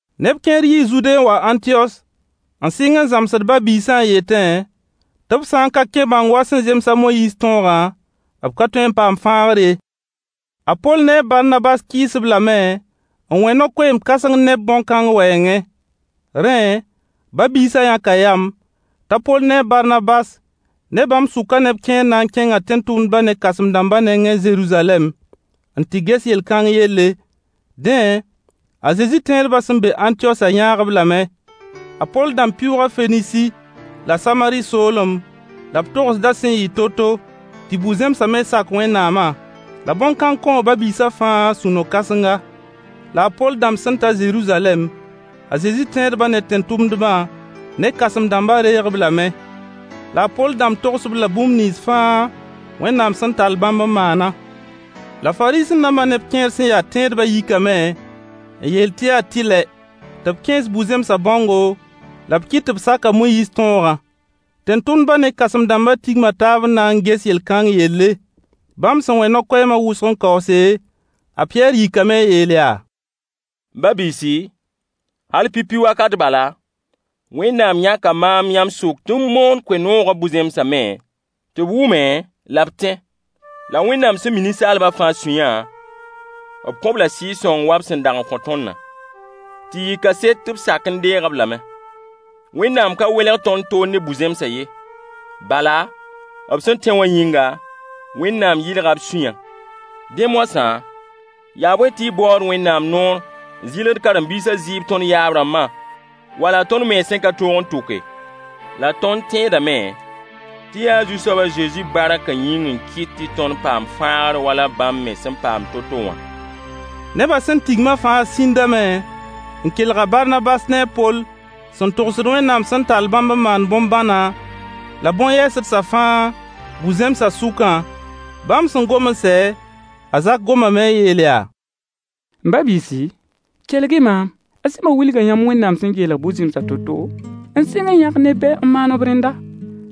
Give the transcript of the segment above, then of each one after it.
Neb kẽer yii Zude n wa Ãntiyos n sɩng n zãmsd ba-biisã n yetẽ tɩ b sã n ka kẽ bãong wa sẽn zems a Moyiis tõogã, b ka tõe n paam fãagr ye. A Poll ne a Barnabas kɩɩs-b lame n wẽ no-koeem-kãseng ne-b bõn-kãng wɛɛngẽ. Rẽ, ba-biisã yãka yam t'a Poll ne a Barnabas ne bãmb sʋkã neb kẽer na n kẽnga tẽn-tʋmdbã ne kãsem-dãmba nengẽ Zeruzalɛm n tɩ ges yel-kãng yelle. Dẽ, a Zezi tẽedbã sẽn be Ãntiyosã yãag-b lame. A Poll dãmb pɩʋʋga Fenisi la Samari soolem la b togsda sẽn yɩ to-to tɩ bu-zẽmsã me sak Wẽnnaamã. La bõn-kãng kõo ba-biisã fãa sũ-no-kãsenga. La a Poll dãmb sẽn ta Zeruzalɛm, a Zezi tẽedba ne tẽn-tʋmdbã ne kãsem-dãmbã reeg-b lame. La a Poll dãmb togs-b la bũmb nins fãa Wẽnnaam sẽn tall bãmb n maana. La Fariisẽ-dãmba neb kẽer sẽn ya tẽedbã yikame n yeel tɩ yaa tɩlɛ tɩ b kẽes bu-zẽmsã bãongo la b kɩt tɩ b sak a Moyiis tõogã. Tẽn-tʋmdbã ne kãsem-dãmba tigma taab n na n ges yel-kãng yelle. Bãmb sẽn wẽ no-koɛɛma wʋsg n kaoose, a Pɩyɛɛr yikame n yeel yaa: M ba-biisi, hal pipi wakat bala, Wẽnnaam yãka maam yãmb sʋk tɩ m moon koe-noogã bu-zẽmsa me tɩ b wʋme la b tẽ. La Wẽnnaam sẽn mi ninsaalbã fãa sũyã, b kõ-b la Sɩɩg-sõng wa b sẽn dag n kõ tõndã, tɩ yɩ kaset tɩ b sak n deeg-b lame. Wẽnnaam ka welg tõnd toor ne bu-zẽmsã ye, bala b sẽn tẽ wã yĩnga, Wẽnnaam yɩlga b sũyã. Dẽ moasã, yaa bõe tɩ y baood Wẽnnaam noor n zɩlgd karen-biisã zɩɩb tõnd yaab-rãmba wala tõnd mens sẽn ka tõog n tʋke? La tõnd tẽedame tɩ yaa Zu-soab a Zezi barkã yĩng n kɩt tɩ tõnd paam fãagr wala bãmb me sẽn paam to-to wã. Nebã sẽn tigma fãa sĩndame n kelg a Barnabas na a Poll sẽn togsd Wẽnnaam sẽn tall bãmb n maan bõn-bãna la bõn-yɛɛsdsã fãa bu-zẽmsã sʋkã. Bãmb sẽn gom n sɛ, a Zak gomame n yeel yaa: M ba-biisi, kelg-y maam. A Sɩmo wilga yãmb Wẽnnaam sẽn geelg bu-zẽmsã to-to n sɩng n yãk neb be n maan b rẽndã.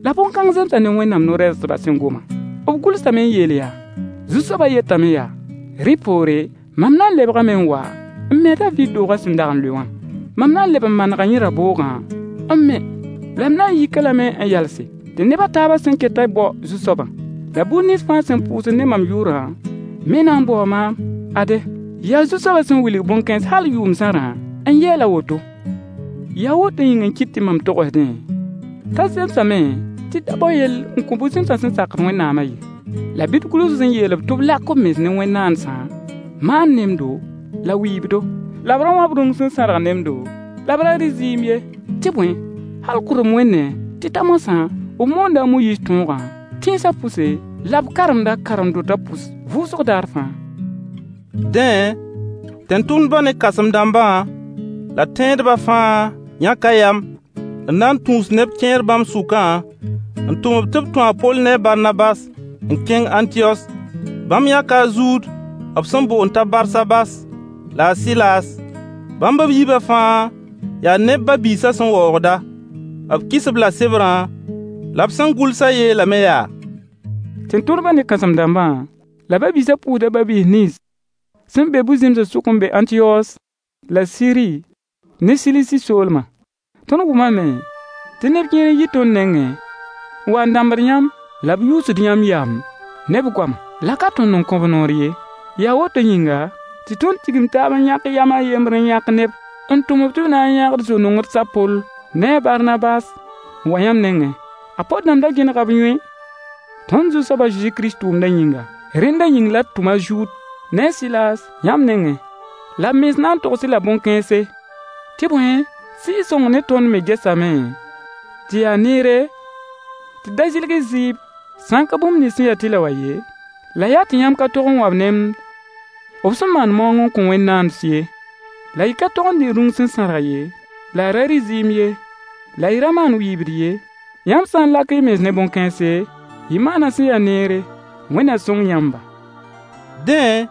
La bõn-kãng zemsa ne Wẽnnaam no-rɛɛsdbã sẽn goma. B gʋlsame n yeel yaa: “Zu-soabã yetame yaa: Rẽ poore, mam na n lebgame n wa n me a Daviid doogã sẽn dag n lʋɩ wã. Mam na n leb n manega yẽ raboogã n me, la m na yik-a lame n yalse, tɩ neb a taabã sẽn ketã bao Zu-soabã. La buud nins fãa sẽn pʋʋsd ne mam yʋʋrã me na n baoo maam. Ade, yaa Zu-soabã sẽn wilg bõn-kãens hal yʋʋm zãrã n yeel a woto.” Yaa woto yĩng n kɩt tɩ mam togsdẽ t'a zemsame tɩ d da bao yell n kõ bu-zẽmsã sẽn sakd Wẽnnaamã ye. La bɩ d gʋls-b n yeel-b tɩ b lak b mens ne wẽn-naandsã maand nemdo la wɩɩbdo, la b ra wãb rũng sẽn sãrg nemdo, la b ra rɩ zɩɩm ye. Tɩ bõe, hal kʋdem wẽndẽ tɩ ta moasã, b moonda a Moyiis tõogã tẽnsã pʋse, la b karemd-a karen-dotã pʋs vʋʋsg daar fãa. Dẽ, tẽn-tʋmdbã ne kãsem-dãmbã la tẽedba fãa yãka yam n na n tũus neb kẽer bãmb sʋkã n tʋm-b tɩ b tũ a Poll ne Barnabas n kẽng Ãntiyos. Bãmb yãka a Zud b sẽn boond t'a Barsabas la a Sɩlaas. Bãmb b yiibã fãa yaa neb ba-biisã sẽn waoogda. B kɩs b la sebrã, la b sẽn gʋlsã yeelame yaa: Tẽn-tʋmdbã ne kãsem-dãmbã, la ba-biisã pʋʋsda ba-biis nins sẽn be bu-zẽmsã sʋk n be Ãntiyos la Siri ne Silisi soolma. Tõnd wʋmame tɩ neb kẽer n yi tõnd nengẽ n wa n dãmbd yãmb la b yuusd yãmb yam ne b goama. La ka tõnd n kõ-b noor ye. Yaa woto yĩnga, tɩ tõnd tigim taab n yãk yam a yembr n yãk neb n tʋm-b tɩ b na n yãag d zo-nongds a Poll ne a Barnabas n wa yãmb nengẽ. A Poll dãmb ra gẽnega b yõe tõnd Zu-soab a Zezi Kirist tʋʋmdã yĩnga. Rẽnda yĩng la d tʋm a Zud ne a Sɩlaas yãmb nengẽ. La b mens na n togs-y la bõn-kãense. Tɩ bõe, Sɩɩg-sõng ne tõnd me gesame tɩ yaa neere tɩ d da zɩlg-y zɩɩb sã n ka bũmb nins sẽn ya tɩlɛ wã ye. La yaa tɩ yãmb ka tog n wãb nemd b sẽn maan maoong n kõ wẽn-naands ye, la y ka tog n dɩ rũng sẽn sãrg ye, la y da rɩ zɩɩm ye, la y ra maan wɩɩbd ye. Yãmb sã n lak y mens ne bõn-kãense, y maana sẽn ya neere. Wẽnd na sõng yãmba. Dẽ,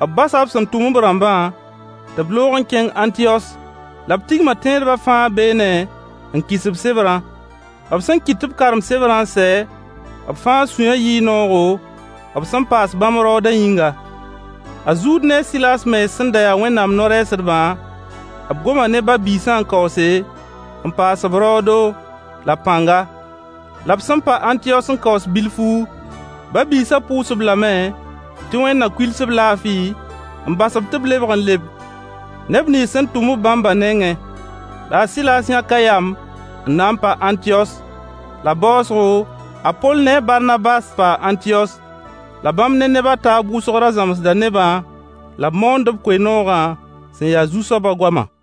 b basa b sẽn tʋm-b rãmbã tɩ b loog n kẽng Ãntiyos. La b tigma tẽedbã fãa beene n kɩs-b sebrã. B sẽn kɩt tɩ b karem sebrã n sɛ, b fãa sũyã yɩɩ noogo, b sẽn paas bãmb raoodã yĩnga. A Zud ne a Sɩlaas mens sẽn da ya Wẽnnaam no-rɛɛsdbã, b goma ne ba-biisã n kaoose, n paas-b raoodo la pãnga. La b sẽn pa Ãntiyos n kaoos bilfu, ba-biisã pʋʋs-b lame tɩ wẽnd na kuils-b laafɩ, n bas-b tɩ b lebg n leb neb nins sẽn tʋm-b bãmbã nengẽ. [ La a Sɩlaas yãka yam n na n pa Ãntiyos.] La baoosgo, a Poll ne a Barnabas paa Ãntiyos. La bãmb ne neb a taab wʋsg ra zãmsda nebã la b moond-b koe-noogã sẽn ya Zu-soabã goama.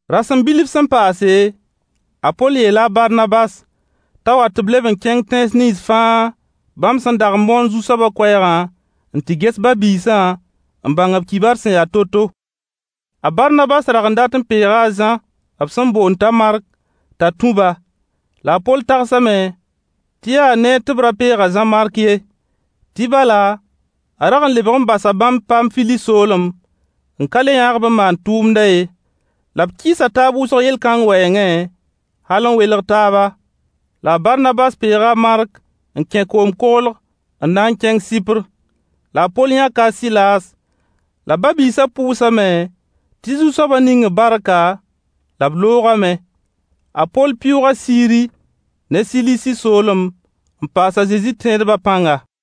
Rasem bilf sẽn paase, a Poll yeela a Barnabas t'a wa tɩ b leb n kẽng tẽns nins fãa bãmb sẽn dag n moon Zu-soabã koɛɛgã n tɩ ges ba-biisã n bãng b kibar sẽn ya to-to. A Barnabas rag n dat n peega a Zã b sẽn boond t'a Mark t'a tũ-ba. La a Poll tagsame tɩ yaa neer tɩ b ra peeg-a Zã-Mark ye. Tɩ bala, a rag n lebg n basa bãmb Paamfili soolem n ka le yãag-b n maan tʋʋmdã ye. La b kɩɩsa taab wʋsg yel-kãng wɛɛngẽ hal n welg taaba. La a Barnabas peega a Mark n kẽ koom-koglg n na n kẽng Sɩpr. La a Poll yãka a Sɩlaas, la ba-biisã pʋʋsame tɩ Zu-soabã ning-b barka, la b loogame. A Poll pɩʋʋga Siri ne Silisi soolem n paas a Zezi tẽedbã pãnga.